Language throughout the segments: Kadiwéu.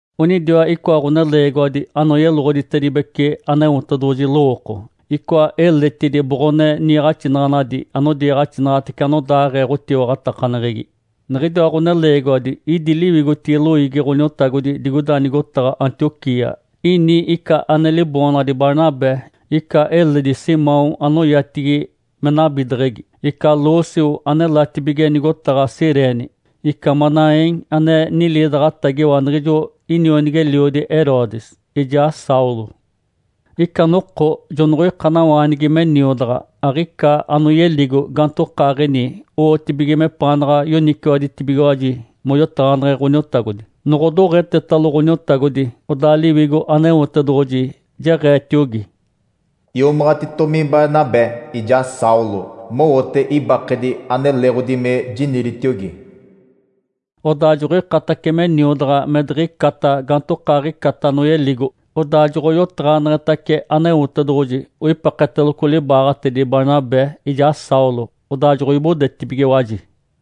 Onidiwa icoa ɡ̶oneleegiwadi anoyeloɡ̶oditedibece Aneotedoɡ̶oji lowooko, icoa eletidi boɡ̶one niiɡ̶axinaɡ̶anadi anodiiɡ̶axinaɡ̶atece anodaaɡ̶ee ɡ̶otiwaɡ̶atakaneɡ̶egi. Niɡ̶idiwa ɡ̶oneleegiwadi idi liwigotigi loiigi Ǥoniotagodi digoida nigotaɡ̶a Antioquia. Ini ica ane liboonaɡ̶adi Barnabé, ica eledi Simão anoyatigi me “Nabideɡ̶egi”, ica Lúcio anelatibige nigotaɡ̶a Cirene, ica Manaém ane niliidaɡ̶atagiwa niɡ̶ijo inionigi-eliodi Herodes, ijaa Saulo. Ica noko jonoɡ̶oikanawaanigi me niodaɡ̶a, aɡ̶ica anoyeligo gaantokaaɡ̶ini owotibige mepaanaɡ̶a yoniciwaditibigiwaji moyotaɡ̶aneɡ̶e Ǥoniotagodi. Noɡ̶odoɡ̶etetalo Ǥoniotagodi, odaa Liwigo Aneotedoɡ̶oji jeɡ̶eetiogi, “Iomaɡ̶atitomi Barnabé ijaa Saulo mowote ibakedi ane leeɡ̶odi me jiniditiogi.” Odaa joɡ̶oikatace me niodaɡ̶a me diɡ̶icata gaantokaaɡ̶icata anoyeligo, odaa joɡ̶oyotaɡ̶aneɡ̶etace Aneotedoɡ̶oji, oipeketeloco libaaɡ̶atedi Barnabé ijaa Saulo, odaa joɡ̶oibodetibigiwaji.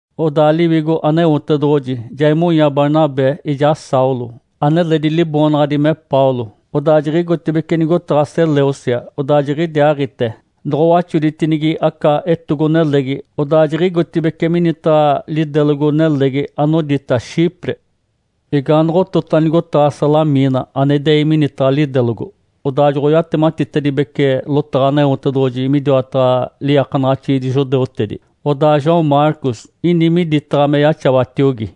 Odaa Liwigo Aneotedoɡ̶oji ja imonya Barnabé ijaa Saulo, aneledi liboonaɡ̶adi me Paulo. Odaa jiɡ̶igotibeci nigotaɡ̶a Selêucia, odaa jiɡ̶idiaaɡ̶ite noɡ̶owaxoditinigi aca etogo-nelegi, odaa jiɡ̶igotibeci minitaɡ̶a lidelogo-nelegi anodita Chipre. Igaanoɡ̶otota nigotaɡ̶a Salamina ane idei minitaɡ̶a lidelogo, odaa joɡ̶oyatematitedibece lotaɡ̶a Aneotedoɡ̶oji midiwataɡ̶a liiakanaɡ̶axiidi judeutedi. Odaa João Marcos ini miditaɡ̶a me yaxawatiogi.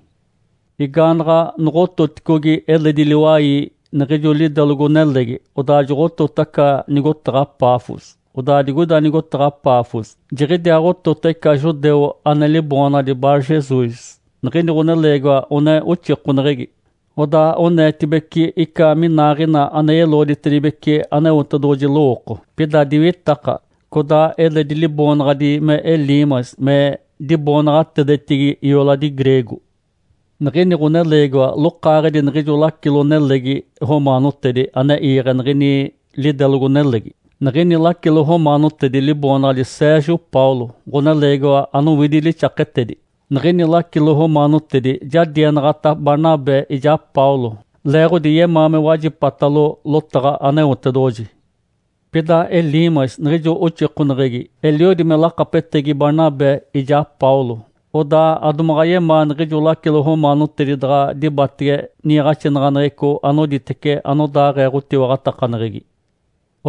Igaanaɡ̶a noɡ̶ototicogi eledi liwai niɡ̶ijo lidelogo-nelegi, odaa joɡ̶otota aca nigotaɡ̶a Pafos. Odaa digoida nigotaɡ̶a Pafos jiɡ̶idiaaɡ̶otota ica judeu ane liboonaɡ̶adi Barjesus, niɡ̶ini ɡ̶oneleegiwa one oxikoneɡ̶egi. Odaa oneetibece ica minaaɡ̶ina ane yeloɡ̶oditedibece Aneotedoɡ̶oji lowooko, pida diwitaka. Codaa eledi liboonaɡ̶adi me Elimas me diboonaɡ̶atedetigi ioladi greego. Niɡ̶ini ɡ̶oneleegiwa lokaaɡ̶edi niɡ̶ijo lacilo-nelegi romaanotedi ane iiɡ̶e niɡ̶ini lidelogo-nelegi. Niɡ̶ini lacilo romaanotedi liboonaɡ̶adi Sérgio Paulo, ɡ̶oneleegiwa anowidi lixaketedi. Niɡ̶ini lacilo romaanotedi ja dienaɡ̶ata Barnabé ijaa Paulo, leeɡ̶odi yemaa me wajipatalo lotaɡ̶a Aneotedoɡ̶oji. Pida Elimas niɡ̶ijo oxikoneɡ̶egi eliodi me lakapetegi Barnabé ijaa Paulo, odaa adomaɡ̶a yemaa niɡ̶ijo lacilo romaanotedi daɡ̶a dibatege niiɡ̶axinaɡ̶aneɡ̶eco anoditece anodaaɡ̶ee ɡ̶otiwaɡ̶atakaneɡ̶egi.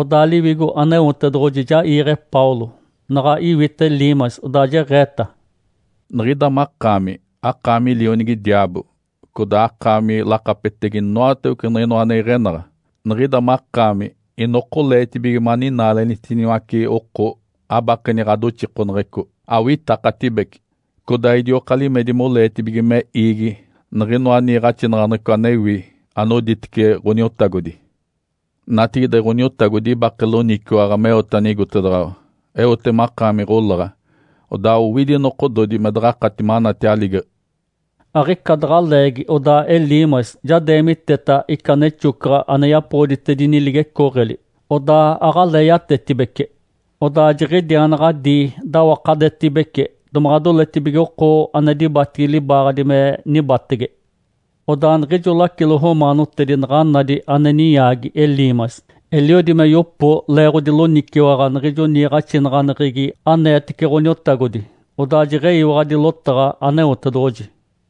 Odaa Liwigo Aneotedoɡ̶oji ja iiɡ̶e Paulo, naɡ̶a iwita Elimas, odaa jeɡ̶eeta, “Niɡ̶ida makaami akaami lionigi diaabo, codaa akaami lakapetegi inoatawece niɡ̶inoa ane iɡ̶enaɡ̶a. Niɡ̶ida makaami inokoleetibige maninaalenitiniwace oko abakeni ɡ̶adoxikoneɡ̶eco. Awitakatibece, codaa idioka limedi moleetibige me iigi niɡ̶inoa niiɡ̶axinaɡ̶aneɡ̶eco anewi anoditece Ǥoniotagodi. Natigide Ǥoniotagodi ibake loniciwaɡ̶a meote anigotedaɡ̶awa. Eote makaami ɡ̶olaɡ̶a, odaa owidi nokododi me daɡ̶akati manati aligeɡ̶e!” Aɡ̶ica daɡ̶a leegi odaa Elimas ja deemiteta ica nexocaɡ̶a ane yapoɡ̶oditedini ligecooɡ̶eli, odaa aɡ̶alee yatetibece. Odaa jiɡ̶idiaanaɡ̶adii dawakadetibece domaɡ̶a doletibige oko ane dibatigi libaaɡ̶adi me nibatege. Odaa niɡ̶ijo lacilo romaanotedi naɡ̶a nadi ane ninyaagi Elimas, eliodi me yopo leeɡ̶odi loniciwaɡ̶a niɡ̶ijo niiɡ̶axinaɡ̶aneɡ̶egi aneetece Ǥoniotagodi, odaa jeɡ̶eyiwaɡ̶adi lotaɡ̶a Aneotedoɡ̶oji.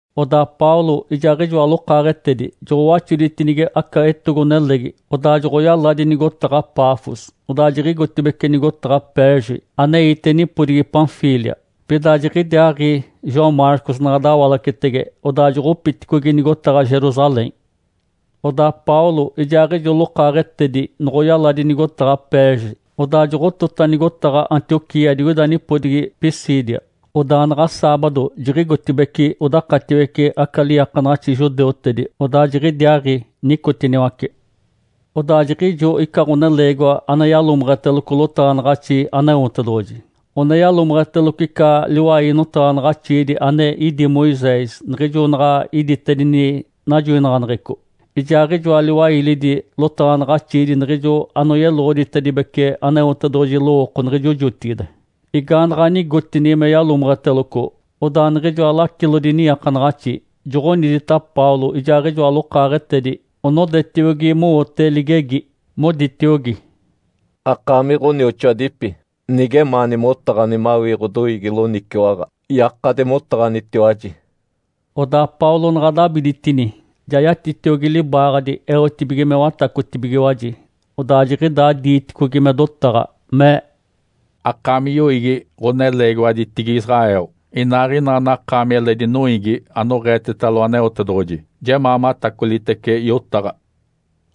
Odaa Paulo ijaaɡ̶ijoa lokaaɡ̶etedi joɡ̶owaxoditinigi aca etogo-nelegi, odaa joɡ̶oyaladi nigotaɡ̶a Pafos. Odaa jiɡ̶igotibeci nigotaɡ̶a Perge aneite nipodigi Panfília. Pida jiɡ̶idiaaɡ̶i João Marcos naɡ̶a dawalacetege, odaa joɡ̶opiticogi nigotaɡ̶a Jerusalém. Odaa Paulo ijaaɡ̶ijo lokaaɡ̶etedi noɡ̶oyaladi nigotaɡ̶a Perge, odaa joɡ̶otota nigotaɡ̶a Antioquia digoida nipodigi Pisídia. Odaa naɡ̶a saabado jiɡ̶igotibeci odakatiwece aca liiakanaɡ̶axi judeutedi, odaa jiɡ̶idiaaɡ̶i nicotiniwace. Odaa jiɡ̶ijo ica ɡ̶oneleegiwa ane yalomeɡ̶eteloco lotaɡ̶anaɡ̶axi Aneotedoɡ̶oji, one yalomeɡ̶eteloco ica liwai notaɡ̶anaɡ̶axiidi ane idí Moisés niɡ̶ijo naɡ̶a iditedini najoinaɡ̶aneɡ̶eco, ijaaɡ̶ijoa liwailidi lotaɡ̶anaɡ̶axiidi niɡ̶ijo anoyeloɡ̶oditedibece Aneotedoɡ̶oji lowooko niɡ̶ijo jotigide. Igaanaɡ̶a nigotini me yalomeɡ̶eteloco, odaa niɡ̶ijoa lacilodi niiakanaɡ̶axi joɡ̶onidita Paulo ijaaɡ̶ijoa lokaaɡ̶etedi onodetiogi mowote ligegi, moditiogi, “Akaami ɡ̶onioxoadipi, nigemaani motaɡ̶ani mawii ɡ̶odoiigi loniciwaɡ̶a, yakadi motaɡ̶anitiwaji.” Odaa Paulo naɡ̶a dabiditini, ja yatitiogi libaaɡ̶adi eotibige me watacotibigiwaji, odaa jiɡ̶idaa diiticogi me dotaɡ̶a, mee, “Akaami yoiigi ɡ̶oneleegiwaditigi Israel, inaaɡ̶ina anakaami eledi noiigi anoɡ̶eetetalo Aneotedoɡ̶oji, jemaa matacolitece yotaɡ̶a!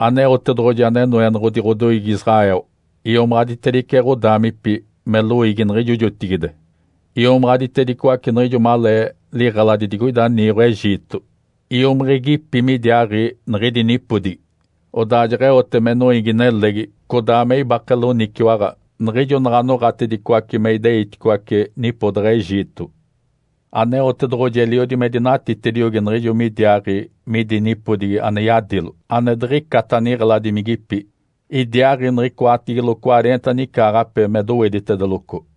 Aneotedoɡ̶oji ane Noenoɡ̶odi ɡ̶odoiigi Israel iomaɡ̶aditedice ɡ̶odaamipi me loiigi niɡ̶ijo jotigide. Iomaɡ̶aditedicoace niɡ̶ijo malee liɡ̶eladi digoida niiɡ̶o Egito, iomiɡ̶igipi midiaaɡ̶i niɡ̶idi nipodigi. Odaa jeɡ̶eote me noiigi-nelegi codaa me ibake loniciwaɡ̶a niɡ̶ijo naɡ̶a noɡ̶atedicoace me ideiticoace nipodaɡ̶a Egito. Aneotedoɡ̶oji eliodi me dinatitediogi niɡ̶ijo midiaaɡ̶i midi nipodigi ane yadilo ane diɡ̶icata niɡ̶eladimigipi. Idiaaɡ̶i niɡ̶icoatigilo cwareenta nicaaɡ̶ape me doweditedeloco.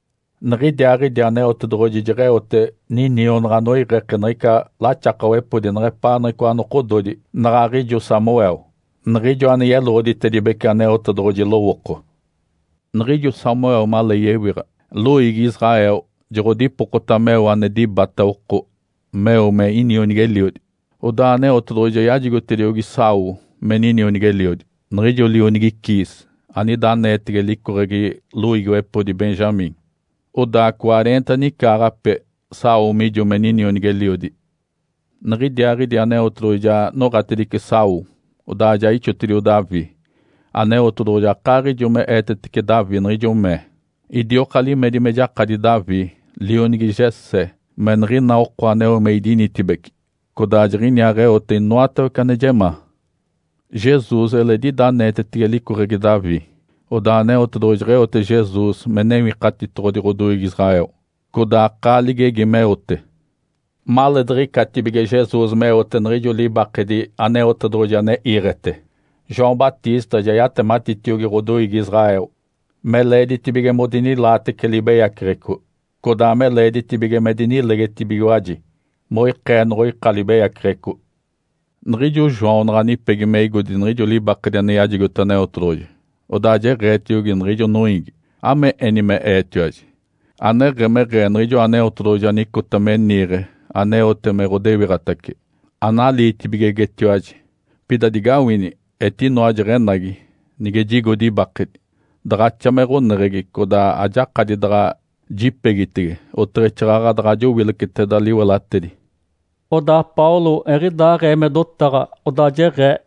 Niɡ̶idiaaɡ̶idi Aneotedoɡ̶oji jeɡ̶eote ninionaɡ̶a anoiɡ̶eke niɡ̶ica laxakawepodi neɡ̶epaa niɡ̶icoa nokododi naɡ̶aɡ̶ijo Samuel, niɡ̶ijo ane yeloɡ̶oditedibece Aneotedoɡ̶oji lowooko. Niɡ̶ijo Samuel malee yewiɡ̶a, loiigi Israel joɡ̶odipokota meo ane dibata oko meo me inionigi-eliodi. Odaa Aneotedoɡ̶oji ja yajigotediogi Saul me ninionigi-eliodi, niɡ̶ijo lionigi Quis, anida aneetege licoɡ̶egi loiigiwepodi Benjamim. Odaa cwareenta nicaaɡ̶ape Saul mijo me inionigi-eliodi. Niɡ̶idiaaɡ̶idi Aneotedoɡ̶oji ja noɡ̶atedice Saul, odaa ja ixotedio Davi. Aneotedoɡ̶oji akaaɡ̶ijo me eetetece Davi niɡ̶ijo mee, ‘Idioka limedi me jakadi Davi, lionigi Jessé, me niɡ̶ina oko aneo me idinitibeci, codaa jiɡ̶iniaaɡ̶eote inoatawece ane jemaa.’ Jesus eledi ida aneetetege licoɡ̶egi Davi. Odaa Aneotedoɡ̶oji jeɡ̶eote Jesus me Newikatitoɡ̶odi ɡ̶odoiigi Israel, codaa akaa ligegi meote. Maleediɡ̶icatibige Jesus meote niɡ̶ijo libakedi Aneotedoɡ̶oji ane iiɡ̶ete, João Batista ja yatematitiogi ɡ̶odoiigi Israel me leeditibige me odinilaatece libeyaceɡ̶eco, codaa me leeditibige me dinilegetibigiwaji moikee noɡ̶oika libeyaceɡ̶eco. Niɡ̶ijo João naɡ̶a nipegi me igodi niɡ̶ijo libakedi ane yajigote Aneotedoɡ̶oji, odaa jeɡ̶eetiogi niɡ̶ijo noiigi, ‘Ame eni me eetiwaji? Aneɡ̶emeɡ̶ee Niɡ̶ijoa Aneotedoɡ̶oji anicota me niiɡ̶e aneote me ɡ̶odewiɡ̶atace, analiitibigegetetiwaji. Pida digawini! Etinoa jeɡ̶enagi nige jigodi ibake. Daɡ̶axa me ɡ̶oneɡ̶egi, codaa ajakadi daɡ̶a jipegitege oteɡ̶exaaɡ̶aɡ̶a daɡ̶a jowileceteda liwelatedi.’” Odaa Paulo eɡ̶idaaɡ̶ee me dotaɡ̶a, odaa jeɡ̶ee,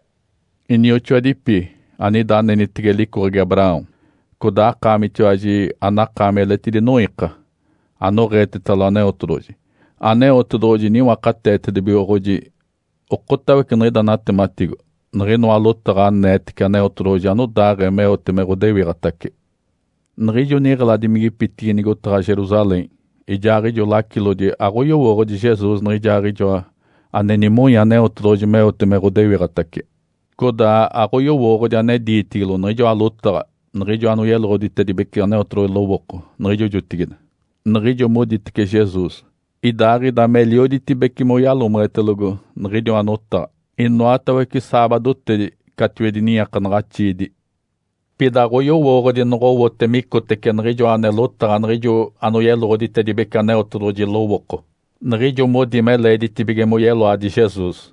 “Inioxoadipi, anida anenitege licoɡ̶egi Abraão, codaa akaamitiwaji anakaami eletidi noiika, anoɡ̶eetetalo Aneotedoɡ̶oji. Aneotedoɡ̶oji niwakateetedibigoɡ̶oji okotawece niɡ̶ida natematigo, niɡ̶inoa lotaɡ̶a aneetece Aneotedoɡ̶oji anodaaɡ̶ee meote me ɡ̶adewikitace. Niɡ̶ijo niɡ̶eladimigipitigi nigotaɡ̶a Jerusalém, ijaaɡ̶ijoa lacilodi aɡ̶oyowooɡ̶odi Jesus nijaaɡ̶ijoa ane nimonya Aneotedoɡ̶oji meote me ɡ̶odewiɡ̶atace. Codaa aɡ̶oyowooɡ̶odi ane diitigilo niɡ̶ijoa lotaɡ̶a niɡ̶ijo anoyeloɡ̶oditedibece Aneotedoɡ̶oji lowooko niɡ̶ijo jotigide, niɡ̶ijo moditece Jesus, idaaɡ̶ida melioditibece moyalomeɡ̶etelogo niɡ̶idiwa notaɡ̶a inoatawece saabadotedi catiwedi niiakanaɡ̶axiidi. Pida aɡ̶oyowooɡ̶odi noɡ̶owote micotece niɡ̶ijoa ane lotaɡ̶a niɡ̶ijo anoyeloɡ̶oditedibece Aneotedoɡ̶oji lowooko, niɡ̶ijo modi me leeditibige moyeloadi Jesus.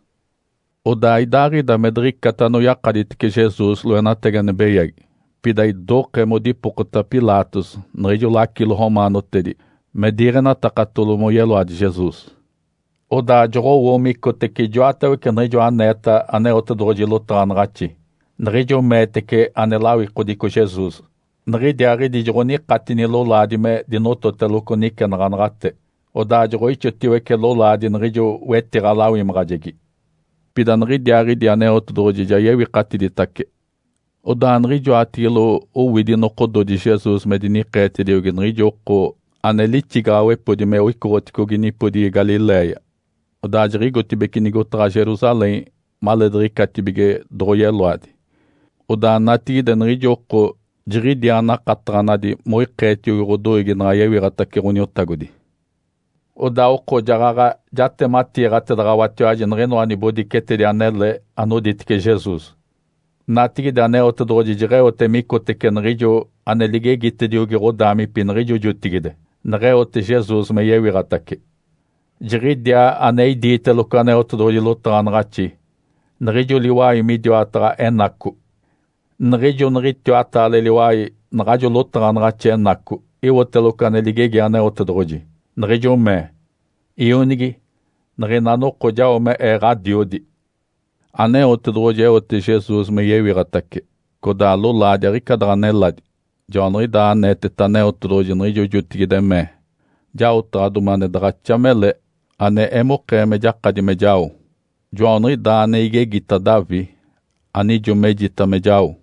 Odaa idaaɡ̶ida me diɡ̶icata anoyakaditece Jesus loenatagi ane beyagi, pida idokee modipokota Pilatos niɡ̶ijo lacilo romaanotedi me diiɡ̶enatakatalo moyeloadi Jesus. Odaa joɡ̶owo micotece ijoatawece niɡ̶ijoa aneeta Aneotedoɡ̶oji lotaɡ̶anaɡ̶axi, niɡ̶ijo meetece ane lawikodico Jesus. Niɡ̶idiaaɡ̶idi joɡ̶onikatini lolaadi me dinototeloco nicenaɡ̶anaɡ̶ate, odaa joɡ̶oixotiwece lolaadi niɡ̶ijo wetiɡ̶a-lawimaɡ̶ajegi. Pida niɡ̶idiaaɡ̶idi Aneotedoɡ̶oji ja yewikatiditace. Odaa niɡ̶ijoatigilo owidi nokododi Jesus me dinikeetediogi niɡ̶ijo oko ane lixigaɡ̶awepodi me icoɡ̶otedicogi nipodigi Galiléia odaa jiɡ̶igotibeci nigotaɡ̶a Jerusalém maleediɡ̶icatibige doɡ̶oyeloadi. Odaa natigide niɡ̶ijo oko jiɡ̶idiaa nakataɡ̶anadi moikeetiogi ɡ̶odoiigi naɡ̶a yewiɡ̶atace Ǥoniotagodi. Odaa oko jaɡ̶aɡ̶a jatematiiɡ̶ataɡ̶awatiwaji niɡ̶inoa nibodicetedi anele anoditece Jesus. Natigide Aneotedoɡ̶oji jeɡ̶eote micotece niɡ̶ijo ane ligegitediogi ɡ̶odaamipi niɡ̶ijo jotigide, neɡ̶eote Jesus me yewiɡ̶atace. Jiɡ̶idiaa ane iditeloco Aneotedoɡ̶oji lotaɡ̶anaɡ̶axi, niɡ̶ijo liwai midiwataɡ̶a Enaco. Niɡ̶ijo niɡ̶itiwataale liwai naɡ̶ajo lotaɡ̶anaɡ̶axi Enaco iwoteloco ane ligegi Aneotedoɡ̶oji, niɡ̶ijo mee, ‘Ionigi. Niɡ̶ina noko jao me Ee Ǥadiodi.’ Aneotedoɡ̶oji eote Jesus me yewiɡ̶atace, codaa lolaadi aɡ̶ica daɡ̶a neladi. Joaniɡ̶idaa aneeteta Aneotedoɡ̶oji niɡ̶ijo jotigide, mee, ‘Jaotaɡ̶adomi ane daɡ̶axa mele ane emokee me jakadi me jao. Joaniɡ̶idaa ane igegita Davi anijo mejita me jao.’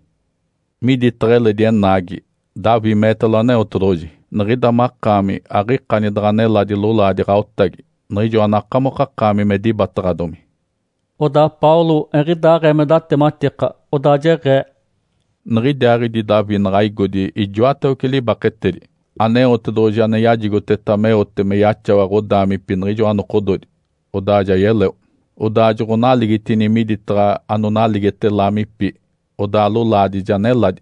Miditaɡ̶a eledi Enaagi, Davi meetalo Aneotedoɡ̶oji, ‘Niɡ̶ida makaami aɡ̶ikani daɡ̶a neladi lolaadi ɡ̶aotagi niɡ̶ijo anakamokakaami me dibataɡ̶adomi.’” Odaa Paulo eɡ̶idaaɡ̶ee me datematika, odaa jeɡ̶ee, “Niɡ̶idiaaɡ̶idi Davi naɡ̶a igodi ijoatawece libaketedi, Aneotedoɡ̶oji ane yajigoteta meote me yaxawa ɡ̶odaamipi niɡ̶ijoa nokododi, odaa ja yeleo. Odaa joɡ̶onaligitini miditaɡ̶a anonaligite laamipi, odaa lolaadi ja neladi.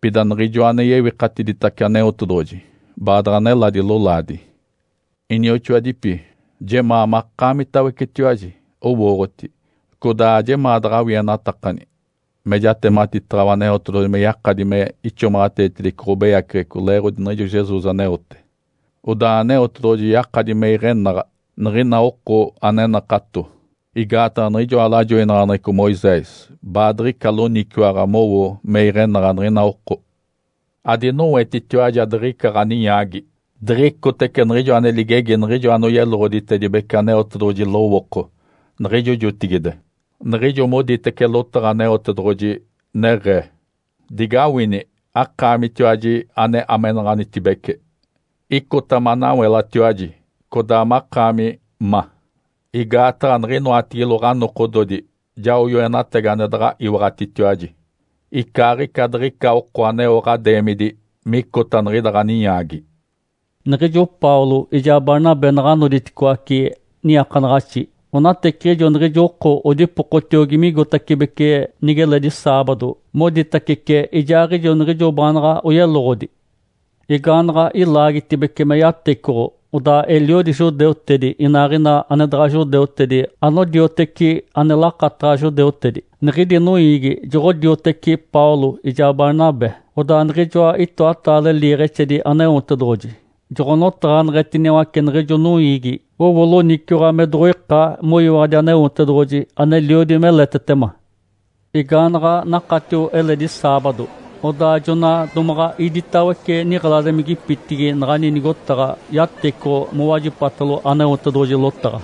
Pida Niɡ̶ijoa ane yewikatiditace Aneotedoɡ̶oji baadaɡ̶a neladi lolaadi. Inioxoadipi, jemaa makaamitawecetiwaji owooɡ̶oti, codaa ajemaa daɡ̶awienatakani, me jatematiiɡ̶ataɡ̶awa Aneotedoɡ̶oji me yakadi me ixomaɡ̶ateetedice ɡ̶abeyaceɡ̶eco leeɡ̶odi niɡ̶ijo Jesus aneote. Odaa Aneotedoɡ̶oji yakadi me iɡ̶enaɡ̶a niɡ̶ina oko ane nakato. Igaataɡ̶a niɡ̶ijoa lajoinaɡ̶aneɡ̶eco Moisés baadiɡ̶ica loniciwaɡ̶a mowo me iɡ̶enaɡ̶a niɡ̶ina oko. Adinowetitiwaji adiɡ̶icaa ɡ̶aninyaagi, diɡ̶icotece niɡ̶ijo ane ligegi niɡ̶ijo anoyeloɡ̶oditedibece Aneotedoɡ̶oji lowooko niɡ̶ijo jotigide, niɡ̶ijo moditece lotaɡ̶a Aneotedoɡ̶oji, neɡ̶ee, ‘Digawini, akaamitiwaji ane amenaɡ̶anitibece! Icota manawelatiwaji, codaa makaami ma! Igaataɡ̶a niɡ̶inoatigilo ɡ̶anokododi jao yoenatagi ane daɡ̶a iwaɡ̶atitiwaji, icaaɡ̶ica diɡ̶ica oko aneo ɡ̶adeemidi micota niɡ̶ida ɡ̶aninyaagi.’” Niɡ̶ijo Paulo ijaa Barnabé naɡ̶a noditicoaci niiakanaɡ̶axi, onateciɡ̶ijo niɡ̶ijo oko odipokotiogi migotacibeci nigeledi saabado moditacece ijaaɡ̶ijo niɡ̶ijo baanaɡ̶a oyeloɡ̶odi. Igaanaɡ̶a ilaagitibece me yatecoɡ̶o, odaa eliodi judeutedi inaaɡ̶ina ane daɡ̶a judeutedi anodioteci ane lakataɡ̶a judeutedi, niɡ̶idi noiigi joɡ̶odioteci Paulo ijaa Barnabé. Odaa niɡ̶ijoa itoataale liiɡ̶exedi Aneotedoɡ̶oji joɡ̶onotaɡ̶aneɡ̶etiniwace niɡ̶ijo noiigi, owo loniciwaɡ̶a me doɡ̶oika moyiwaɡ̶adi Aneotedoɡ̶oji aneliodi meletetema. Igaanaɡ̶a nakatio eledi saabado, odaa jona domaɡ̶a iditawece niɡ̶eladimigipitigi naɡ̶ani nigotaɡ̶a yatecoɡ̶o mowajipatalo Aneotedoɡ̶oji lotaɡ̶a.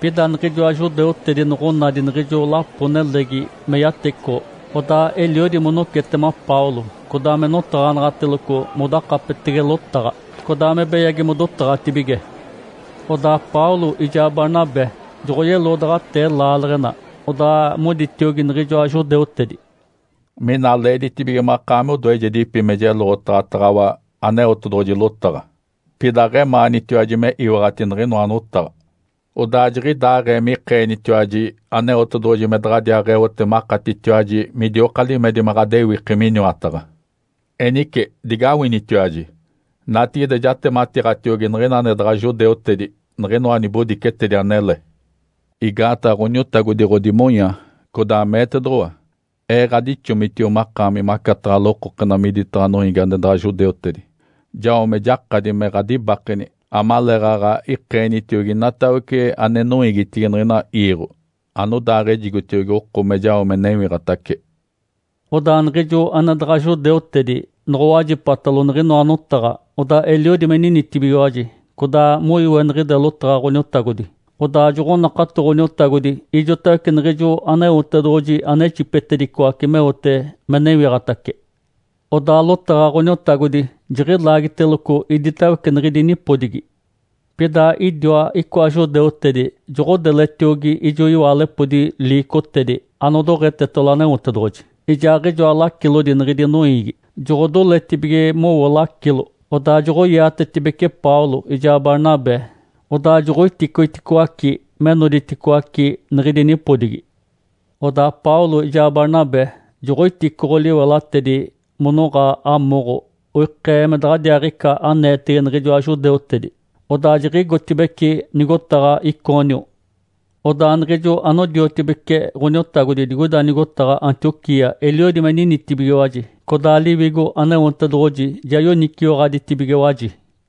Pida niɡ̶ijoa judeutedi noɡ̶onadi niɡ̶ijo lapo-nelegi me yatecoɡ̶o, odaa eliodi monocetema Paulo, codaa me notaɡ̶anaɡ̶ateloco modakapetege lotaɡ̶a, codaa me beyagi modotaɡ̶atibige. Odaa Paulo ijaa Barnabé joɡ̶oyeloodaɡ̶atee laaleɡ̶ena, odaa moditiogi niɡ̶ijoa judeutedi, “Mina leeditibige makaami odoejedipi me jeloɡ̶otaɡ̶ataɡ̶awa Aneotedoɡ̶oji lotaɡ̶a. Pida aɡ̶emaanitiwaji me iwaɡ̶ati niɡ̶inoa notaɡ̶a, odaa jiɡ̶idaaɡ̶ee mikeenitiwaji Aneotedoɡ̶oji me daɡ̶adiaaɡ̶eote makatitiwaji midioka limedi me ɡ̶adewiki miniwataɡ̶a. Enice digawinitiwaji! Natigide jatematiiɡ̶atiogi niɡ̶ina ane daɡ̶a judeutedi niɡ̶inoa nibodicetedi anele. Igaataɡ̶a Ǥoniotagodi ɡ̶odimonya, codaa meetedoɡ̶owa, ‘Ee ɡ̶adixomitio makaami macataɡ̶a lokokena miditaɡ̶a noiigi ane daɡ̶a judeutedi jao me jakadi me ɡ̶adibakeni amaleeɡ̶aɡ̶a ikeenitiogi inatawece ane noiigitigi niɡ̶ina iiɡ̶o anodaaɡ̶ejigotiogi oko me jao me newiɡ̶atace.’” Odaa niɡ̶ijo ane daɡ̶a judeutedi noɡ̶owajipatalo niɡ̶inoa notaɡ̶a, odaa eliodi me ninitibigiwaji, codaa moiweniɡ̶ide lotaɡ̶a Ǥoniotagodi. Odaa joɡ̶onakato Ǥoniotagodi ijotawece niɡ̶ijo Aneotedoɡ̶oji ane ixipetedicoace meote me newiɡ̶atace. Odaa lotaɡ̶a Ǥoniotagodi jiɡ̶ilaagiteloco iditawece niɡ̶idi nipodigi. Pida idiwa icoa judeutedi joɡ̶odeletiogi ijo iwaalepodi liicotedi anodoɡ̶etetalo Aneotedoɡ̶oji, ijaaɡ̶ijoa lacilodi niɡ̶idi noiigi, joɡ̶odoletibige mowo lacilo. Odaa joɡ̶oiatetibeci Paulo ijaa Barnabé, odaa joɡ̶oiticoiticoaci me noditicoaci niɡ̶idi nipodigi. Odaa Paulo ijaa Barnabé joɡ̶oiticoɡ̶o liwelatedi monoɡ̶a amoɡ̶o oikee me daɡ̶adiaaɡ̶ica aneetege niɡ̶ijoa judeutedi. Odaa jiɡ̶igotibeci nigotaɡ̶a Icônio. Odaa niɡ̶ijo anodiotibece Ǥoniotagodi digoida nigotaɡ̶a Antioquia eliodi me ninitibigiwaji, codaa Liwigo Aneotedoɡ̶oji ja yoniciwaɡ̶aditibigiwaji.